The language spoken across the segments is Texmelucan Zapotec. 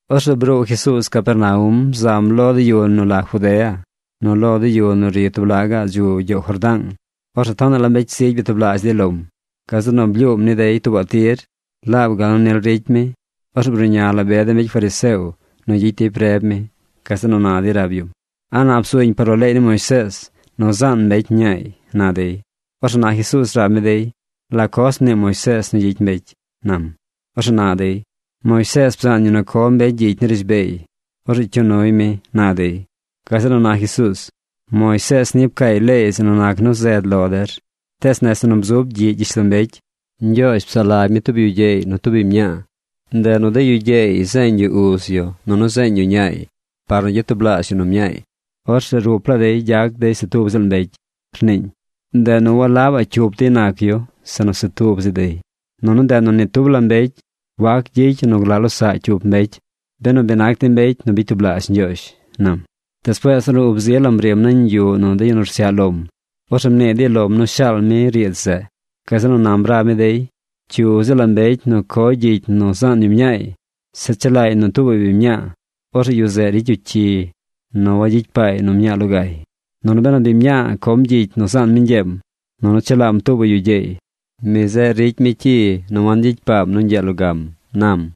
Orzeꞌ bruu Jesuuz Capernaum zam lo de yu nu la Judea nunu lo de yu nu ri tub laꞌ gaꞌ dzu gyoow Jordaang. Orzeꞌ tonaꞌ la mbecy zigy byatublaazh dey lom. Gazeꞌ nu blyuum ni dey tuubaꞌ tir laab gal nu nil ricy mi. Orzeꞌ bruꞌña la be de mbecy fariseo nu gyicy dey preb mi. Gazeꞌ nu na dey rab yum: ―¿A nap zuñ par lo leey ni Moisees nu zaan mbecy mñaay? ―na dey. Orzeꞌ na Jesuuz rab mi dey: ―¿La coz mnii Moisees nu gyicy mbecy? ―nam. Orzeꞌ na dey: ―Moisees bzaan yu nu co mbecy gyicy ni rishbeey. Orzeꞌ cyuu nuy mi ―na dey. Gazeꞌ nu na Jesuuz: ―Moisees ni pcaay leey zeꞌ nu nac nu zed lo der. Tees nese nu bzub gyiꞌ gyishlombecy “Ñgyoozh psaꞌ lagy mi tub yu gyeey nu tub biñ mñaa. Ndeꞌ nu de yu gyeey zeeñ yu uz yu nunu zeeñ yu ñaay par nu gyatublaazh yu nu mñaay. Orzeꞌ lo rup laa dey gyac dey se tub ziꞌl mbecy”, rniiñ. Ndeꞌ nu walabaꞌ cyup dey nac yu, sinu se tub zi dey. Nunu ndeꞌ nu ni tub la mbecy wac gyicy yu nu glaꞌ losaꞌ cyup mbecy, benu bi nac dey mbecy nu bicy tublaazh Ñgyoozh ―nam. Despuees ornu ub zi lam rim nañ yuꞌ nu de yu nu rsyaꞌ lom, orzeꞌ mnii dey lom nu shaal mi riidz zeꞌ. Gazeꞌ nu nam rab mi dey: ―Cyu ziꞌl la mbecy nu coy gyicy nu zaan yu mñaay, zeꞌ chelaay nu tuubaꞌ biñ mñaa, orzeꞌ yu zeꞌ ricy yu cyi nu wangyicy paay nu mñaa logay. Nunu benu biñ mñaa com gyicy nu zaan mi ñgyeem nunu chelaam tuubaꞌ yu gyeey, mi zeꞌ ricy mi cyi nu wangyicy paam nu ñgyee logam ―nam.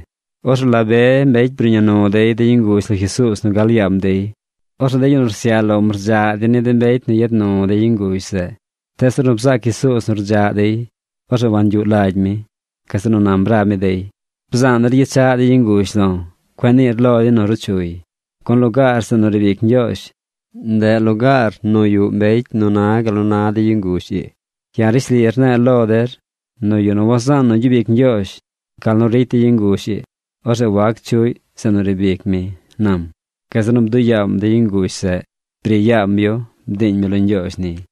Orzeꞌ la be mbecy bruꞌña nu dey de yu nguzh lo Jesuuz nu gal yaam dey. Orzeꞌ de yu nu rsyaꞌ lom rdzaꞌ dey ni de mbecy nu yad nu de yu nguzh zeꞌ. Tees ornu bzaac Jesuuz nu rdzaꞌ dey, orzeꞌ wangyuꞌ lagy mi. Gazeꞌ nu nam rab mi dey: ―Bzaan der gyechaꞌ de yu nguzh lo̱. Cueꞌ niir lo dey nu ruu chuy, gun lugaar zeꞌ nu riib ic Ñgyoozh, ndeꞌ lugaar nu yuꞌ mbecy nu na gal nu na de yu nguzh ii. Ya̱ rishli rne̱e̱ lo der nu yu nu wazaan nu gyub ic Ñgyoozh gal nu ricy de yu nguzh ii, orzeꞌ wac chuꞌy zeꞌ nu riib ic mi ―nam. Gazeꞌ nu bduꞌ yaam de yu nguzh zeꞌ. Bri yaam yu. Bdiiñ mi lo Ñgyoozh niy.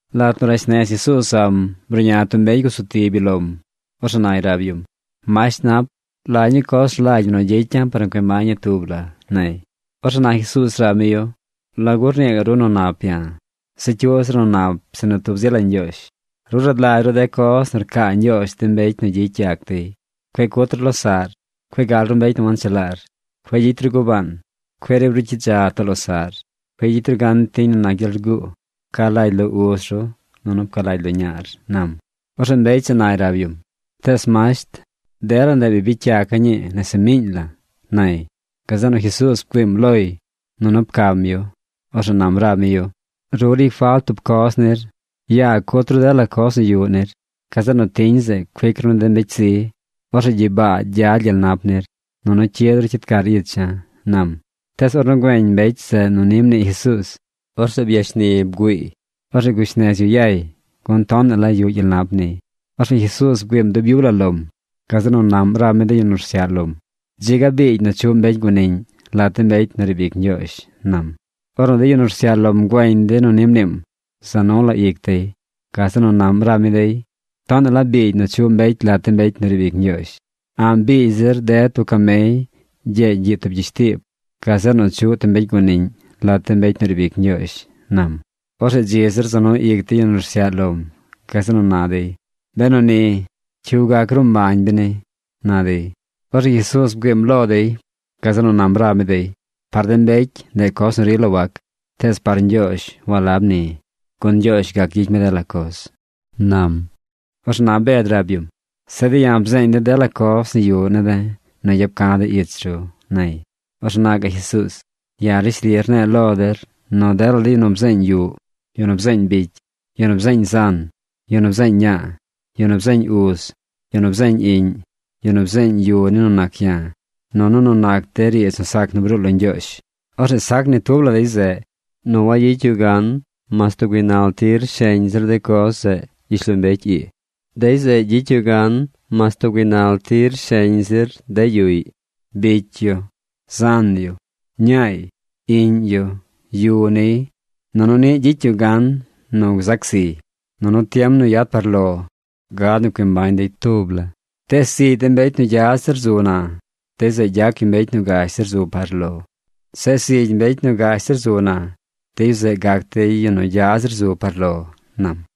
Lat nu rash nez Jesuuz zam, bruꞌña tub mbecy gusu tib yu lom. Orzeꞌ nay rab yum: ―Masht nap, ¿la ñuu coz rlagy ñi nu gyicya̱ par nu cui mbaña̱ tub la? ―nay. Orzeꞌ na Jesuuz rab mi yu: ―¿La gu rnii gaꞌ ru nu nap ya̱? Se cyuꞌ zir nu nap sinu tub zi la Ñgyoozh. Ru rad lagy ru de coz nu rcaa Ñgyoozh de mbecy nu gyicy yac dey. Cueꞌ cut ru losaꞌr. Cueꞌ gal ru mbecy nu wanchelaar. Cueꞌ gyicy ru gubaan. Cueꞌ riib ru gyidza too losaꞌr. Cueꞌ gyicy ru gan tiñ nu nac gyel rguu. Pca lagy lo uz ru nunu pca lagy lo ñaar ―nam. Orzeꞌ mbecy zeꞌ nay rab yum: ―Tees masht, dela ndeꞌ bi bicy yaca̱ ñii nese miiñ la ―nay. Gazeꞌ nu Jesuuz bgüiim loy nunu pcam yu. Orzeꞌ nam rab mi yu: ―Ru ricy falt tub coz nir. Yaa cut ru dela coz nu yuꞌ nir. Gazeꞌ nu tiñ zeꞌ cuic ru ni de mbecy zi. Orzeꞌ gyibaa gyad gyel nap nir. Nunu cyid ru cyid car icha̱ ―nam. Tees ornu güeñ mbecy zeꞌ nu ni mnii Jesuuz, orzeꞌ byashni bgüiiy. Orzeꞌ gush nez yu yay, gun tonaꞌ la yuꞌ gyel nap niy. Orzeꞌ Jesuuz bgüiim dub yub la lom. Gazeꞌ nu naꞌm rab mi de yu nu rsyaꞌ lom: ―¡Dzi ga biigy nu chuꞌ mbecy guaniꞌñ lat de mbecy nu riib ic Ñgyoozh! ―nam. Ornu de yu nu rsyaꞌ lom güeñ dey nu ni mniim, za nu la ic dey. Gazeꞌ nu naꞌm rab mi dey: ―¡Tonaꞌ la biigy nu chuꞌ mbecy lat de mbecy nu riib ic Ñgyoozh! A̱ꞌ biigy zir ded tub camey gyeegy gyiꞌ tub gyishtiib gazeꞌ nu chuꞌ tub mbecy guaniꞌñ lat de mbecy nu riib ic Ñgyoozh ―nam. Orzeꞌ dzi zir za nu ic de yu nu rsyaꞌ lom. Gazeꞌ nu na dey: ―Benu ni, ¿cyu gac gruu mbañ beni? ―na dey. Orzeꞌ Jesuuz bgüiim lo dey. Gazeꞌ nu nam rab mi dey: ―Par de mbecy ndeꞌ coz nu rila wac, tees par Ñgyoozh walab ni, gun Ñgyoozh gac gyicy mi dela coz ―nam. Orzeꞌ na Bed rab yum: ―Zeꞌ de̱ ya̱ bzeeñ de̱ dela coz nu yuꞌ ne̱ de̱ nu yap ca̱ de̱ ich ru ―nay. Orzeꞌ na gaꞌ Jesuuz: ―Ya̱ rishli rne̱e̱ lo der nu dela de yu nu bzeeñ yuꞌ, yu nu bzeeñ bicy, yu nu bzeeñ zan, yu nu bzeeñ ñaa, yu nu bzeeñ uz, yu nu bzeeñ iꞌñ, yu nu bzeeñ yu ni nu nac ya̱ nunu nu nac de riidz nu sac nu bruu lo Ñgyoozh, orzeꞌ sac ni tub la dey zeꞌ nu wayicy yu gan mas tub gaaynal tir sheñ zir de coz zeꞌ gyishlombecy ii. Dey zeꞌ gyicy yu gan mas tub gaaynal tir sheñ zir de yuꞌy, bicy yu, zan yu, ñaay, iꞌñ yu, yu niy, nunu niꞌ gyicy yu gan nu gzac ziy. Nunu tiem nu yad par lo gad nu cui mbañ dey tub la. Tees zigy de mbecy nu gya zir zu na, dey zeꞌ gyac yu mbecy nu gash zir zu par lo. Zeꞌ zigy mbecy nu gash zir zu na, de yu zeꞌ gac dey yu nu gya zir zu par lo ―nam.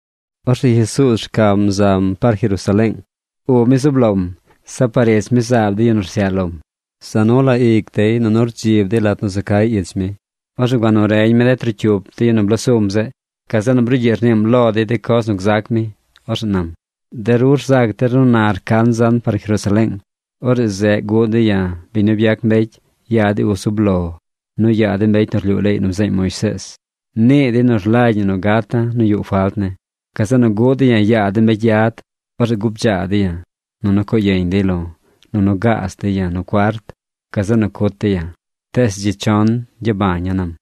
Orzeꞌ Jesuuz rcam zam par Jerusaleeng. Ub mi zub lom. Zeꞌ par ich mi zaab de yu nu rsyaꞌ lom. Za nu la ic dey nunu rdzib dey lat nu za cay ich mi. Orzeꞌ gua nu reñ mi de trocyup de yu nu bloo sum zeꞌ. Gazeꞌ nu brugyiꞌ rniim lo dey de coz nu gzac mi. Orzeꞌ nam: ―De ru rzac der nu na rcan zan par Jerusaleeng. Orzeꞌ zeꞌ guꞌ dey ya̱, biñ nu byac mbecy, yaa de uz zub lo, nu yaa de mbecy nu rlyuu leey nu bzeeñ Moisees. Nii dey nu rlagy ñi nu gata̱ nu yuꞌ falt ne̱. Gazeꞌ nu guꞌ dey ya̱ yaa de mbecy yad. Orzeꞌ gubdzaa dey ya̱, nunu coo yeñ dey lo̱, nunu gaaz dey ya̱ nu cuart. Gazeꞌ nu cut dey ya̱. Tees dzi chon gyabaña̱ ―nam.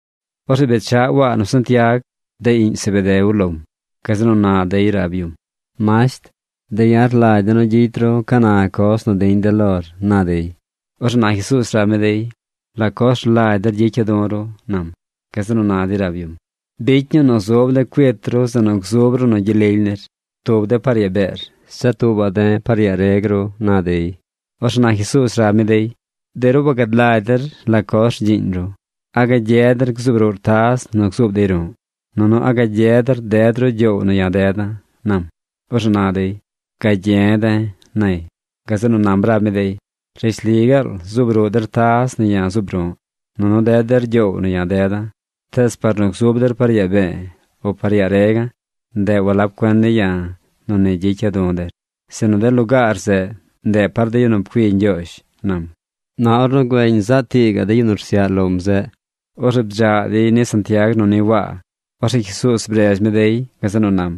Orzeꞌ bechaꞌ Waa nu Santiag, de iꞌñ Zebedeo lom. Gazeꞌ nu na dey rab yum: ―Masht, de̱ ya̱ rlagy de̱ nu gyicy ru ca na coz nu diñ de̱ lor ―na dey. Orzeꞌ na Jesuuz rab mi dey: ―¿La coz rlagy der gyicya̱ du̱ ru? ―nam. Gazeꞌ nu na dey rab yum: ―Bicy ñuu nu zub de̱ cuit ru zeꞌ nu gzub ru nu gyel lily nir: tub de̱ par yaa beer, zeꞌ tuubaꞌ de̱ par yaa reg ru ―na dey. Orzeꞌ na Jesuuz rab mi dey: ―De ru wagad lagy der la coz rgyiiñ ru. ¿A gagye der gzuub ruꞌr taz nu gzub dey ru̱ꞌ? Nunu ¿a gagye der ded ru gyoow nu ya̱ deda̱? ―nam. Orzeꞌ na dey: ―Gagye̱ de̱ ―nay. Gazeꞌ nu nam rab mi dey: ―Rishli gaal zuub ruꞌ der taz nu ya̱ zuub ru̱ꞌ nunu ded der gyoow nu ya̱ deda̱. Tees par nu gzuub der par yaa be̱e̱ o par yaa rega̱, ndeꞌ walab cuen ne̱ ya̱ nu ni gyicya̱ du̱ der; sinu de lugaar zeꞌ, ndeꞌ par de yu nu pcui Ñgyoozh ―nam. Na ornu güeñ zaꞌ tii gaꞌ de yu nu rsyaꞌ lom zeꞌ, orzeꞌ bdzaꞌ dey ni Santiag nu ni Waa. Orzeꞌ Jesuuz bredz mi dey. Gazeꞌ nu nam: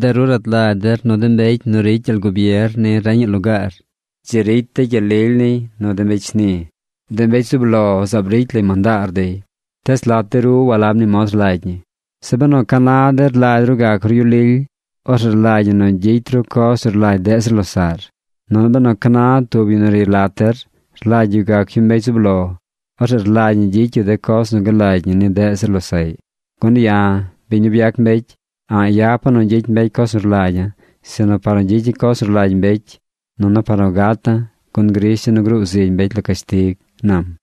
―De ru rad lagy der nu de mbecy nu ricy gyel gubier ni reñaꞌ lugaar, dzi ricy dey gyel lily niy nu de mbecy shni. De mbecy zub lo zaab ricy lay mandaar dey. Tees lat de ru walab ni mod rlagy ñi. Zeꞌ benu ca na der rlagy ru gac ru yu lily, orzeꞌ rlagy ñi nu gyicy ru coz nu rlagy deꞌ zir losaꞌy. Nunu benu ca na tub yu nu ri lat der rlagy yu gac yu mbecy zub lo, orzeꞌ rlagy ñi gyicy yu de coz nu galagy ñi ni deꞌ zir losaꞌy. Gun ya̱, biñ nu byac mbecy, a̱ꞌ yapa̱ nu gyicy mbecy coz nu rlagya̱, sinu par nu gyicya̱ coz nu rlagy mbecy nunu par nu gata̱, gun grisha̱ nu gruu zigy mbecy lo cashtig ―nam.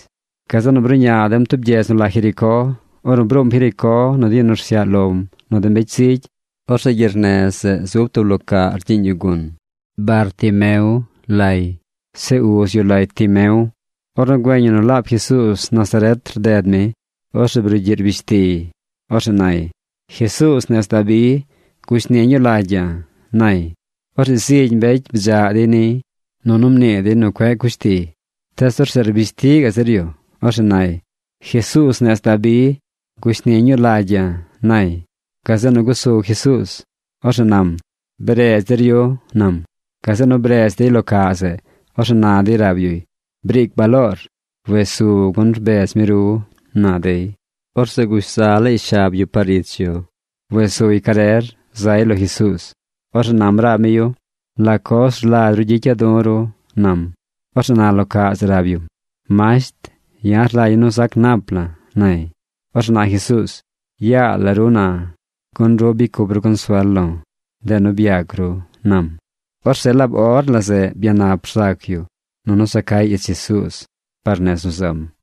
Gazeꞌ nu bruꞌña dem tub gyedz nu la Jericó. Ornu bruum Jericó nu de yu nu rsyaꞌ lom nu de mbecy zigy, orzeꞌ gyernez zeꞌ zub tub lo caꞌ rgyiiñ yu gun. Bartimeo lay. Zeꞌ uz yu lay Timeo. Ornu güeñ yu nu laab Jesuuz Nazaret rded mi, orzeꞌ brugyiꞌ rbish tiy. Orzeꞌ nay: ―¡Jesuuz nez Dabi, gushni ñuu lagy ya̱! ―nay. Orzeꞌ zigy mbecy bdzaꞌ dey niy, nunu mnii dey nu cueꞌ cush tiy. Tees orzeꞌ rbish ti gaꞌ zir yu. Orzeꞌ nay: ―¡Jesuuz nez Dabi, gushni ñuu lagy ya̱! ―nay. Gazeꞌ nu gusu Jesuuz. Orzeꞌ nam: ―Bredz der yu ―nam. Gazeꞌ nu bredz dey lo caꞌ zeꞌ. Orzeꞌ na dey rab yuy: ―Briic baloor. Wes su gun rbedz mi ru ―na dey. Orzeꞌ gush za laay shab yu par ich yu. Wes suy carer zay lo Jesuuz. Orzeꞌ nam rab mi yu: ―¿La coz rlagy ru gyicya̱ du̱ ru? ―nam. Orzeꞌ na lo caꞌ zeꞌ rab yum: ―Masht, ya̱ rlagya̱ nu zac nap la̱ ―nay. Orzeꞌ na Jesuuz: ―Yaa la ru na gun ru bicy cup ru consuel lo̱. Ndeꞌ nu byac ru ―nam. Orzeꞌ laab or la zeꞌ byanap rzac yu nunu za cay ich Jesuuz par nez nu zam.